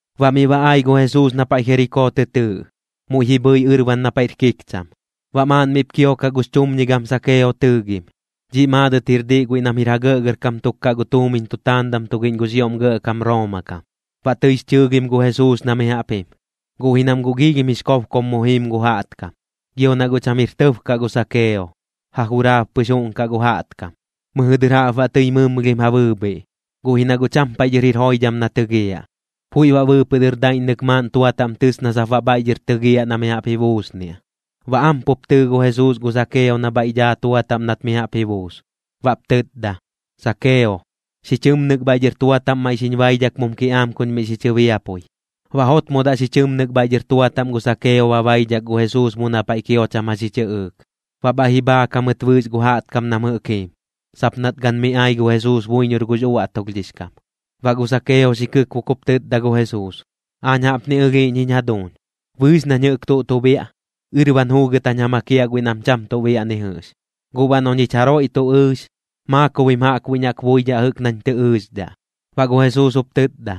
Baꞌ miꞌ ba ai gu Jesuus na paiꞌ Jerikoo tɨ tɨɨꞌ, muiꞌ ji bhɨi ɨrban na paiꞌr kikcham. Baꞌ maaꞌn miꞌp kiokaꞌ gux chumñigam Sakeo tɨɨgim, dhiꞌ maadɨt jir diꞌ kaꞌ guiꞌ nam jir ja gɇꞌgɇrkam tuk gu tuumiñ tutaandam tugiꞌñ gux ioꞌm gɇꞌkam Rooma kam. Baꞌ tɨix chɨɨgim gu Jesuus na mi jaꞌp jim, guꞌ ji nam guꞌ giilhim jix kobkom mu jiim gu jaꞌtkam. Gio na guꞌ cham jir tɇb kaꞌ gu Sakeo, ja juraab pɨx juꞌnkaꞌ gu jaꞌtkam. Mɨjɨ dɨr jaꞌp baꞌ tɨi mɨmlhim ja bɨɨbhiꞌ, guꞌ ji na guꞌ cham paiꞌ dhɨr jir joidham na tɨgiaꞌ. Puiꞌ baꞌ bɨɨpɨꞌ dɨr daiꞌññɨk maaꞌn tua taꞌm tɨs na sap baꞌ bhaiꞌ dhɨr tɨgiaꞌ na mi jaꞌp ji buusniaꞌ. Baꞌ am pup tɨɨ gu Jesuus gu Sakeo na bhaiꞌ dhaa tua taꞌm nat mi jaꞌp ji buus, baꞌp tɨtda: ―Sakeo, xi chɨmnɨk bhaiꞌ dhɨr tua taꞌm maiꞌ xiñ baidhak mum kiꞌaam kuñ miꞌ xi chɨbiapui. Baꞌ jotmodaꞌ xi chɨmnɨk bhaiꞌ dhɨr tua taꞌm gu Sakeo ba baidhak gu Jesuus mu na paiꞌ kio cham jax ji chɨꞌɨɨk. Baꞌ bhaiꞌ ji bhaak jamɨt bɨɨx gu jaꞌtkam nam jɨꞌk jiim, sap nat gan mi ai gu Jesuus buiñor gux uaꞌtulhdhix kam. Baꞌ gu Sakeo xi kɨkbok jup tɨtda gu Jesuus: ―Aañ jaꞌpni ɨlhiiꞌñ jiñ jaduuñ. Bɨɨx nañ jɨꞌk tuꞌ tu biaꞌ, ɨrban juugɨt jañ ja makiaꞌ guiꞌ nam cham tuꞌ biaꞌ ni jɨꞌx. Guꞌ baꞌ noꞌ ñich jaroiꞌ tuꞌ ɨɨx, maakobim jaꞌkbuiꞌñ jaꞌk buidhaꞌ jɨꞌk nañ tɨ ɨɨxdhaꞌ. Baꞌ gu Jesuus jup tɨtda: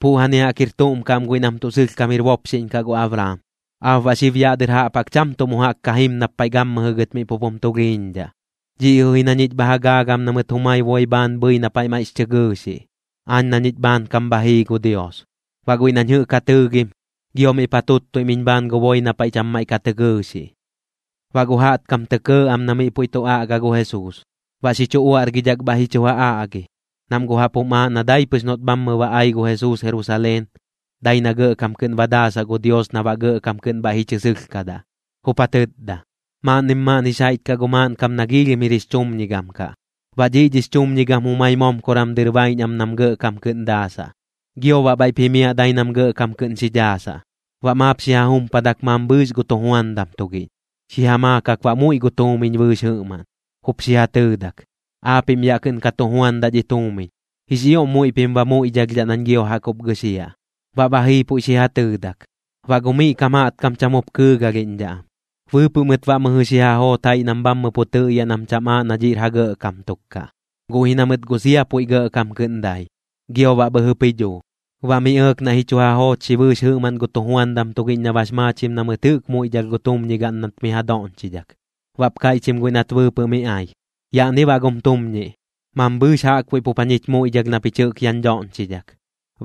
―Puꞌjani jaꞌk jir tuꞌm kaꞌ am guiꞌ nam tuꞌ sɨlhkam jir bopxiꞌñ kaꞌ gu Abraam. Aap baꞌ xib yaꞌ dɨr jaꞌp jaꞌk cham tuꞌ mu jaꞌk ka jim nap paiꞌ gammɨjɨ gɨt miꞌ pup jum tulhiiñdhaꞌ. Dhiꞌ jɨꞌ ji na ñich bha ja gaagam na mɨt jumai boi bhaan bhɨi na paiꞌ maiꞌx chɨ gɨɨxiꞌ, aañ na ñich bhaankam bha jii gu Dios. Baꞌ guiꞌ nañ jɨꞌk ja tɨɨgim, gio miꞌp ja tuttuim iñ bhaan gu boi na paiꞌ cham maiꞌ ka tɨ gɨɨxiꞌ. Baꞌ gu jaꞌtkam tɇ kɇɇ am na miꞌ puiꞌ tu aꞌga gu Jesuus. Baꞌ xi chu uaꞌrgidhak bhaiꞌ ji chu ja aꞌgi, nam guꞌ jaꞌp jum aaꞌ na dai pɨx noꞌt bhammɨ ba ai gu Jesuus Jerusaleen, dai na gɇꞌkam kɨꞌn ba daasaꞌ gu Dios na baꞌ gɇꞌkam kɨꞌn bhaiꞌ ji chɨ sɨlhkadaꞌ. Jup ja tɨtda: ―Maaꞌnnim maaꞌn jix jaiꞌch kaꞌ gu maaꞌnkam na giilhim jir jix chumñigam kaꞌ. Baꞌ dhiꞌ dhix chumñigam jumai momkoram dɨr baiꞌñ am nam gɇꞌkam kɨꞌn daasaꞌ, gio baꞌ bhaiꞌp jimiaꞌ dai nam gɇꞌkam kɨꞌn xi dhaasaꞌ. Baꞌ maap xi ja jumpadak mambhɨɨx gu tujuandam tugiꞌñ, xi ja maakak baꞌ muiꞌ gu tuumiñ bɨɨx jɨꞌmaꞌn, jup xi ja tɨɨdak: “Aapiꞌm yaꞌ kɨꞌn ka tu juandaꞌ dhi tuumiñ. Jix ioꞌm muiꞌ pim ba muiꞌdhalhdhaꞌ nañ gio jaꞌk jup gɨxiaꞌ.” Baꞌ ba jii puiꞌ xi ja tɨɨdak. Baꞌ gu miꞌ kam jaꞌtkam cham jup kɨɨgalhiꞌñdhaꞌ am, bɨɨpɨꞌ mɨt baꞌ mɨjɨ xi ja joot jaiꞌ nam bhammɨ pu tɨꞌyaꞌ nam cham aaꞌ na dhiꞌr ja gɇꞌkam tuk kaꞌ. Guꞌ ji na mɨt guꞌ sia puiꞌ gɇꞌkam kɨꞌn dai, gio baꞌ bhɨjɨp ji dhuu. Baꞌ miꞌ ɇɇk naiꞌ ji chu ja joochxi bɨɨx jɨꞌmaꞌn gu tujuandam tugiꞌñ na bax maachim na mɨt jɨꞌk muiꞌdhalh gu tumñigaꞌn nat miꞌ ja doꞌñchidhak. Baꞌp kaiꞌchim guiꞌ nat bɨɨpɨꞌ miꞌ ai: “Yaꞌni baꞌ gum tumñiꞌ. Mambhɨɨx jaꞌkbuiꞌ pup jañich muiꞌdhalh na pich jɨꞌk yaꞌñ dhoꞌñchidhak.”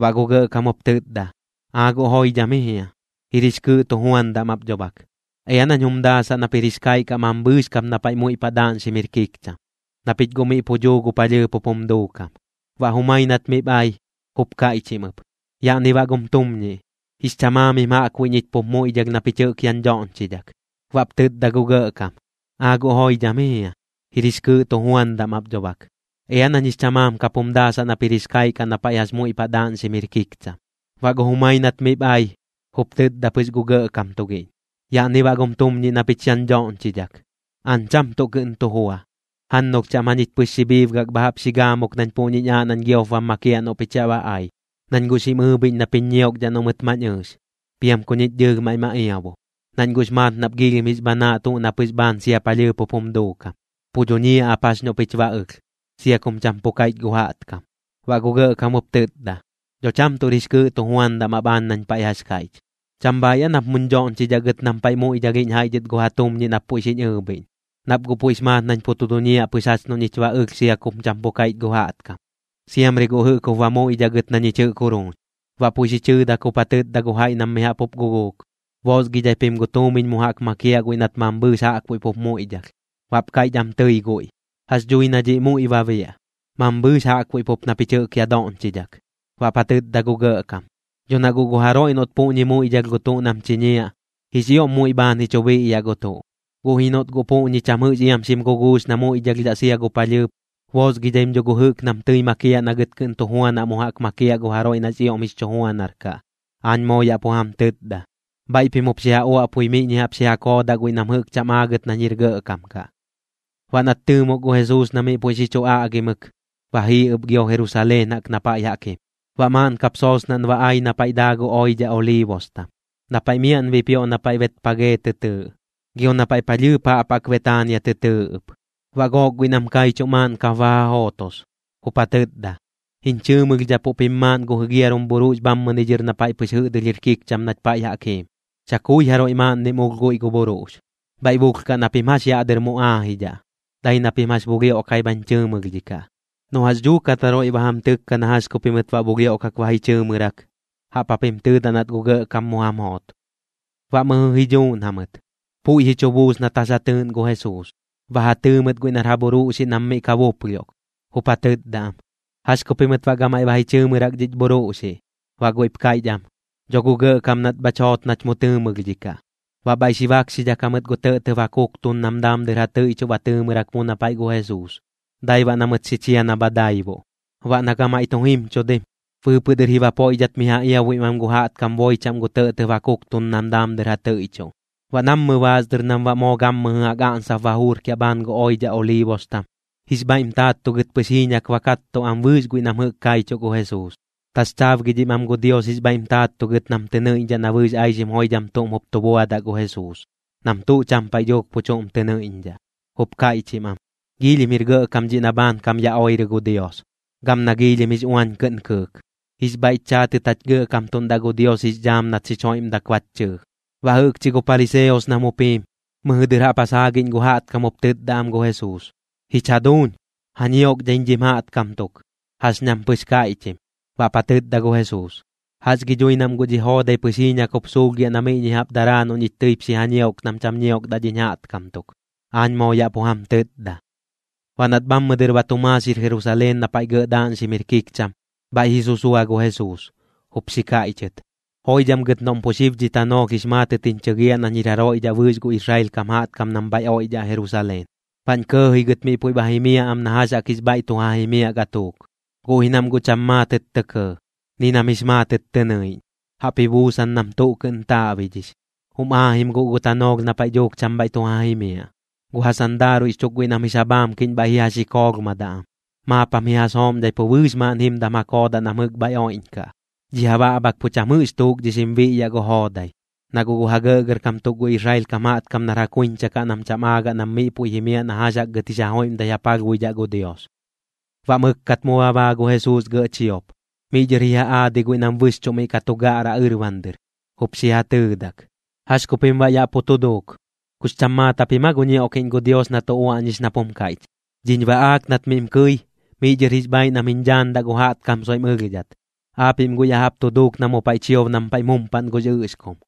Baꞌ gu gɇꞌkam jup tɨtda: “¡Aa guꞌ joidham ji jia! Jir jix kɨɨꞌ tujuandam ap dho bak. Ea nañ jum daasaꞌ nap jir jix kaiꞌ kaꞌ mambhɨɨx kap na paiꞌ jax muiꞌ paꞌ daaꞌñxim jir kikcham, na pich guꞌ miꞌ pu dhuu gu palhɨɨp jup jum duukam.” Baꞌ jumai nat miꞌp ai, jup kaiꞌchim ɨp: “Yaꞌni baꞌ gum tumñiꞌ. Jix chamaamim jaꞌkbuiꞌ ñich pup muiꞌdhalh na pich jɨꞌk yaꞌñ dhoꞌñchidhak.” Baꞌp tɨtda gu gɇꞌkam: “¡Aa guꞌ joidham ji jia! Jir jix kɨɨꞌ tujuandam ap dho bak. Ea nañ jix chamaam kap jum daasaꞌ nap jir jix kaiꞌ kaꞌ na paiꞌ jax muiꞌ paꞌ daaꞌñxim jir kikcham.” Baꞌ gu jumai nat miꞌp ai, jup tɨtda pɨx gu gɇꞌkam tugiꞌñ: “Yaꞌni baꞌ gum tumñiꞌ na pich yaꞌñ dhoꞌñchidhak. Aañ cham tuꞌ kɨꞌn tu jua. Jannulh chaꞌm jañich pɨx xi bhiibgak bha jaꞌp xi gaamuk nañ puꞌñiñ aaꞌ nañ giop bam makiaꞌ noꞌ pich yaꞌ ba ai. Nañ guꞌ xim ɨɨbhiꞌñ nap jiñ ñiokdhaꞌ noꞌ mɨt mañ ɨɨx, piam ku ñich dɨɨlh maiꞌ ma iabu. Nañ guꞌx maat nap giilhim jix bhanaaꞌ tuꞌ na pɨx bhaan sia palhɨɨp jup jum duukam, pu duñiaꞌ ap jax noꞌ pich ba ɨlh, sia kum cham pu kaiꞌch gu jaꞌtkam.” Baꞌ gu gɇꞌkam jup tɨtda: “Dho cham tuꞌr jix kɨɨꞌ tujuandam ap aañ nañ paiꞌ jax kaiꞌch. ¿Cham bhaaiꞌ aa nap muñ dhoꞌñchidhaꞌ gɨt nam paiꞌ muiꞌdhalhiꞌñ jaiꞌ dhɨt gu ja tumñiꞌ nap puiꞌ xiñ ɨɨbhiꞌñ, nap guꞌ puiꞌx maat nañ pu tu duñiaꞌ pɨx jax noꞌ ñich ba ɨlh sia kum cham pu kaiꞌch gu jaꞌtkam? Siamri guꞌ jɨꞌk jup ba muiꞌdhaꞌ gɨt na ñich jɨꞌk juruuñ.” Baꞌ puiꞌ xi chɨɨdak jup ja tɨtda gu jaiꞌ nam mi jaꞌp guguuk: “Boosgidhai pim gu tuumiñ mu jaꞌk makiaꞌ guiꞌ nat mambhɨɨx jaꞌkbuiꞌ pup muiꞌdhalh.” Baꞌp kaiꞌch am tɨi guiꞌ: “¿Jax dhui na dhiꞌ muiꞌ ba biaꞌ, mambhɨɨx jaꞌkbuiꞌ pup na pich jɨꞌk yaꞌ doꞌñchidhak?” Baꞌp ja tɨtda gu gɇꞌkam: “Dho na guꞌ gu jaroiꞌ noꞌt puꞌñi muiꞌdhalh gu tuꞌ nam chiñiaꞌ, jix ioꞌm muiꞌ bhaan ji chu biꞌyaꞌ gu tuꞌ. Guꞌ ji noꞌt guꞌ puꞌñi cham jɨꞌx iam xim guguux na muiꞌdhalhdhaꞌ sia gu palhɨɨp, boosgidhaim dho gu jɨꞌk nam tɨi makiaꞌ na gɨt kɨꞌn tu juanaꞌ mu jaꞌk makiaꞌ gu jaroiꞌ nax ioꞌm jix chu juanar kaꞌ, aañ moo yaꞌ pu jam tɨtda.” Bhaiꞌ pim jup ja uaꞌpui miꞌñi jaꞌp xi ja koodaꞌ guiꞌ nam jɨꞌk cham aagɨt nañ jir gɇꞌkam kaꞌ. Baꞌ nat tɨɨmok gu Jesuus na miꞌ puiꞌ xi chu aꞌgimɨk, ba jii ɨp gio Jerusaleen jaꞌk na paiꞌ jaꞌk jim. Baꞌ maaꞌn kap soosnaꞌn ba ai na paiꞌ daa gu oidhaꞌ Oliibostam, na paiꞌ miaꞌn bipioꞌ na paiꞌ Betpajee tɨ tɨɨꞌ, gio na paiꞌ palhɨɨp jaꞌp jaꞌk Betaania tɨ tɨɨꞌ ɨp. Baꞌ gook guiꞌ nam kaichuꞌ maaꞌn kap ba ja jootos, jup ja tɨtda: ―Jiñ chɨɨmɨlhdhapuꞌ pim maaꞌn gu jigiarum bhuruꞌx bhammɨni dhɨr na paiꞌ pɨx jɨꞌdɨlh jir kikcham nach paiꞌ jaꞌk jiim, chakui jaroiꞌ maaꞌnnim ulh guiꞌ gu bhuruꞌx. Bhaiꞌ bulhkaꞌ na pim jax yaꞌ dɨr mu aajidhaꞌ. Dai na pim jax bulhioꞌkai bhañ chɨɨmɨlhdhikaꞌ. Noꞌ jax dhuukat jaroiꞌ ba jam tɨkka na jax ku pimɨt baꞌ bulhioꞌkak ba ji chɨɨmɨrak, jaꞌp japim tɨɨdaꞌ nat gu Gɇꞌkam mu jam joot. Baꞌ mɨjɨ ji dhuuꞌn jamɨt, puiꞌ ji chu buus nat jax ja tɨɨꞌn gu Jesuus. Ba ja tɨɨ mɨt guiꞌ nar ja bhuruꞌxiꞌ nam miꞌ ka buplhioꞌk, jup ja tɨtda am: ―¿Jax ku pimɨt baꞌ gamaiꞌ ba ji chɨɨmɨrak dhich bhuruꞌxiꞌ? Baꞌ guiꞌp kaiꞌch am: ―Dho gu Gɇꞌkam nat bhach joot nach mu tɨɨmɨlhdhikaꞌ. Baꞌ bhaiꞌ xi bakxidhak jamɨt gu tɇꞌtɇb ja kuktun nam daam dɨr ja tɨiꞌchuꞌ ba tɨɨmɨrak mu na paiꞌ gu Jesuus, dai baꞌ na mɨt xi chia na bha daibuꞌ. Baꞌ na gamaiꞌ tu jimchudim, bɨɨpɨꞌ dɨr ji bapoiꞌdhat miꞌ ja iabuim am gu jaꞌtkam boi chaꞌm gu tɇꞌtɇb ja kuktun nam daam dɨr ja tɨiꞌchuꞌ. Baꞌ nammɨ baas dɨr nam baꞌ moo gammɨjɨ jaꞌk aꞌnsap ba juurkiaꞌ bhaan gu oidhaꞌ Oliibostam, jix bhaiꞌm taattugɨt pɨx jiiñak ba kattuꞌ am bɨɨx guiꞌ nam jɨꞌk kaichuꞌ gu Jesuus, taxchaabgidhim am gu Dios jix bhaiꞌm taattugɨt nam tɨ nɨiꞌñdhaꞌ na bɨɨx aixim joidham tuꞌm jup tu buadaꞌ gu Jesuus, nam tuꞌ cham paiꞌ dhuuk pu chuꞌm tɨ nɨiꞌñdhaꞌ. Jup kaiꞌchim am: ―¡Jix oiꞌm jir gɇꞌkam dhiꞌ na bhaankam ya oirɨ gu Dios, gam na joidham jix uañ kɨꞌn kɨɨk! ¡Jix bhaiꞌch chaatɨt jach gɇꞌkamtuꞌndaꞌ gu Dios jix dhaam nat xich joiꞌmdak bach chɨɨ! Baꞌ jɨꞌkchi gu pariseos nam jup jiim, mɨjɨ dɨr jaꞌp ja saagiꞌñ gu jaꞌtkam jup tɨtda am gu Jesuus: ―Jich jaduuñ, ja ñiokdhaiñ dhim jaꞌtkam tuk. Jax ñam pɨx kaiꞌchim. Baꞌp ja tɨtda gu Jesuus: ―Jax gi dhui nam guꞌ dhi joodai pɨx jiiñak jup suulhgiaꞌ na miꞌñi jaꞌp daraa noꞌ ñich tɨip xi ja ñiok nam cham ñiokdaꞌ dhiñ jaꞌtkam tuk, aañ moo yaꞌ pu jam tɨtda. Baꞌ nat bhammɨ dɨr ba tu maaxir Jerusaleen na paiꞌ gɇꞌ daaꞌñxim jir kikcham, bhaiꞌ ji susua gu Jesuus, jup xi kaiꞌchɨt: ―¡Joidham gɨt noꞌm pu xib dhi tanoolh jix maatɨt jiñ chɨgiaꞌ nañ jir jaroiꞌ dhaꞌ bɨɨx gu Israel kam jaꞌtkam nam bhaiꞌ oiꞌdhaꞌ Jerusaleen, baꞌñ kɇɇji gɨt miꞌ puiꞌ ba jimiaꞌ am na jax jaꞌk jix bhaiꞌ tu ja jimiaꞌ gatuuk! Guꞌ ji nam guꞌ cham maatɨt tɇ kɇɇ, ni nam jix maatɨt tɨ nɨiꞌñ, jaꞌp ji buusan nam tuꞌ kɨꞌn taaꞌbidhix. Jum aajim guꞌ gu tanoolh na paiꞌ dhuuk cham bhaiꞌ tu ja jimiaꞌ, gu ja sandaaruiꞌx chuk guiꞌ nam jix ja bhaamkiꞌñ bhaiꞌ ji ja xikoolhmadaꞌ am, maap jam ji ja sooꞌmdhai pu bɨɨx maaꞌn jimdam ja koodaꞌ nam jɨꞌk bhaiꞌ oiꞌñkaꞌ. Dhi ja baꞌbhak pu cham jɨꞌk tuukdhixim biꞌyaꞌ gu joodai, na guꞌ gu ja gɇꞌgɇrkam tuk gu Israel kam jaꞌtkam nar ja kuiñcha kaꞌ nam cham aagaꞌ nam miꞌ puiꞌ jimiaꞌ na jax jaꞌk gɨt jix joiꞌmdai ja palhbuidhaꞌ gu Dios. Baꞌ mɨkkat mu ba baa gu Jesuus gɇꞌ chiop. Miꞌ dhɨr ji ja aadi guiꞌ nam bɨxchuꞌ miꞌ ka tu gaꞌra ɨrban dɨr, jup xi ja tɨɨdak: ―¿Jax ku pim baꞌ yaꞌ pu tu duuk? ¿Kux cham maat japim aa gu ñioꞌkiꞌñ gu Dios na tu uaꞌñix nap jum kaiꞌch: “Dhiñ baꞌaak nat miꞌm kɨi, miꞌ dhɨr jix bhaiꞌ nam jiñ dhaandaꞌ gu jaꞌtkam soiꞌm ɨlhdhat”? Aapiꞌm guꞌ ya jaꞌp tu duuk na mu paiꞌ chiob nam paiꞌm jumpaꞌn gux ɨꞌxkum.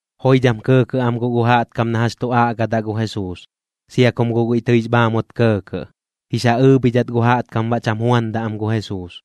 Joidham kɇɇkɇꞌ am guꞌ gu jaꞌtkam na jax tu aꞌgadaꞌ gu Jesuus, sia kum guꞌ guiꞌ tɨix bhaamut kɇɇkɇꞌ. Jix ja ɨɨbhidhat gu jaꞌtkam baꞌ cham juandaꞌ am gu Jesuus.